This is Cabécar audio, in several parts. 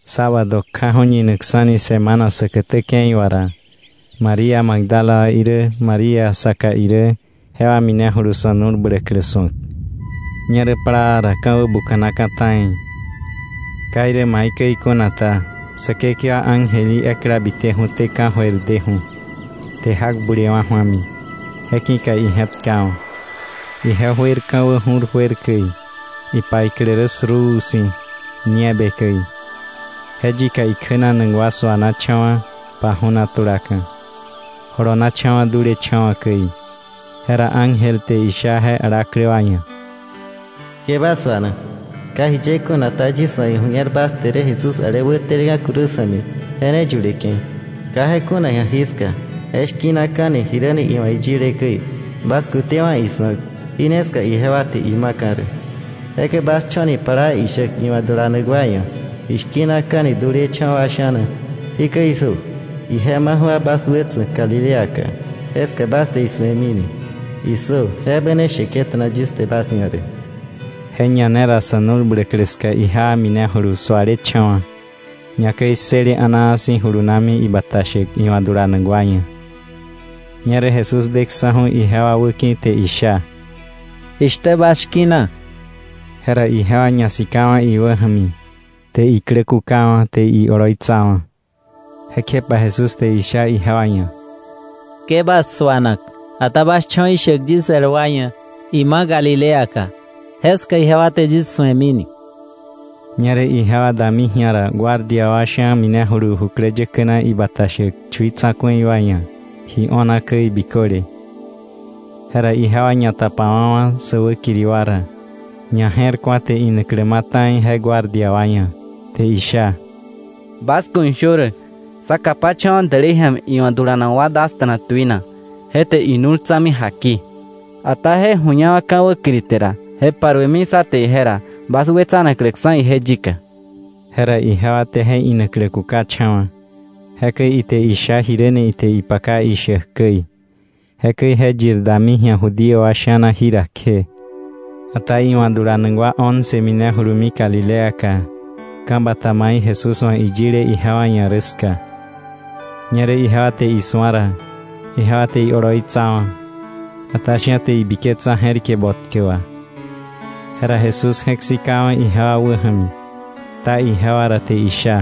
Sábado kjaju̱, ñinaksa̱ni semana säkätä ke̱i wà ra, María Magdala wa irä María saka irä jewa minejulu sa̱ nu̱l bläklä su̱ak. Ñerä plaa ra ka̱ wäbuka̱naka̱ ta̱i. Ka irä maikäi kuna ta, Säkekewa ángel í ekla biteju̱té ka̱jöir deju̱, te jak bulewa̱ ju̱ami, je ki̱ka ije̱tkawa̱. Ije juer ka̱wä ju̱r juer käi, ipaiklä rä suruu si̱ nieve käi. Je yika ikjänanak wa suanacha̱wa̱, paju̱na tulaka̱, jolonacha̱wa̱ dulecha̱wa̱ käi. Jera ángel te isha je alaklä wa ia̱: —Ke bas suana. Ka jiye kuna ta, yis wa̱ iju̱ñer bas te rä Jesús ale wäteleka̱ cruz ja̱mi, je ne yuleke̱. Ka je kuna ji̱a jiska; je shki̱naka̱ni, jiräni iwa̱ iyile käi. Bas kutewa̱ isu̱ak, jí ne ska ijewa te ima̱ka̱ rä. Jekäi bas cho̱ni plaa ishäk iwa̱ dulanak wa ia̱: ‘Ishki̱naka̱ni dulecha̱wa̱ wa sha̱na. Jikäi issö: Ije maju̱ba bas wätsa̱k Galileaka; jeska bas te isu̱emini.’ ¡Issö! Je ebä ne sheke̱ta̱na yis te bas ia̱ rä. Je ñanera ra sa̱ nu̱l bläklä ska ijewa minejulu sualecha̱wa̱, ñakäi ssële a̱naa si̱, julunami ibata shäk iwa̱ dulanak wa ia̱. Ñerä Jesús deksa̱ju̱ ijewa wäki̱ te isha: —¿Jishtä bas shki̱na? Jera ijewa ñasikawa̱ iwäja̱mi, te iklä kukawa̱, te ioloitsawa̱. Jekjepa Jesús te isha ijewa ia̱: —Ke bas suana. Ata bas cho̱ ishäk yis el wa ia̱ ima Galileaka, jeska ijewa te yis su̱emini. Ñerä ijewa dami ji̱a ra, guardia wa sha̱ minejulu jukläyäkä na ibata shäk chui tsa̱ku̱i wa ia̱ ji o̱na käi biköle. Jera ijewa ñatapawa̱wa̱ sä wäkiri wa ra, ñaje̱rku̱a te inaklä ma̱ ta̱i je guardia wa ia̱, te isha: —Bas ku̱ shö rä: Sá kapacha̱wa̱ dälei ja̱mi iwa̱ dulanak wa dasta̱na tuina, je te inu̱l tsa̱mi jaki. Ata je ju̱ñawa̱ ka̱ wäkiri te ra, je paruemi sá te ije ra bas wetsanakläksa̱ ije yika. Jera ijewa te je inaklä kukacha̱wa̱. Jekäi ite isha jiräni ite ipaka ishäk käi. Jekäi je yir dami ji̱a Judío wa sha̱na jira kje. Ata iwa̱ dulanak wa once minejulumi Galileaka, ka̱ bata mai Jesús wa̱ iyile ijewa ia̱ rä ska. Ñerä ijewa te isu̱a ra, ijewa te ioloitsawa̱, ata sha̱ te ibiketsa je̱rike botkä wa. Jera Jesús je̱k sikawa̱ ijewa wäja̱mi, kta ijewa ra, te isha: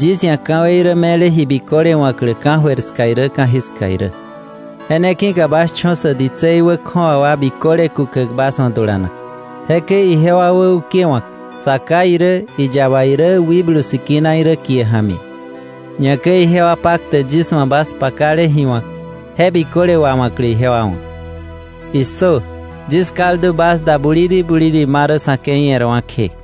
—Yis ia̱ ka̱wei rä me̱le ji biköle wa̱klä ka̱jöir ska irä ka̱jiska irä. Je ne ki̱ka bas cho̱ sä ditsei wä kju̱awa wa biköle kukäk bas wa̱ dulanak, jekäi ijewa wäukewa̱k Sa Ká irä, iyaba irä, Wikblu Sikina irä kie ja̱mi, ñakäi ijewa paktäk yis wa̱ bas pakale ji wa̱k je biköle wawa̱klä ijewa wa̱. ¡Issö! Yis kaldu bas da buliri buliri ma rä sa̱ ke̱i e̱rwa̱ kje.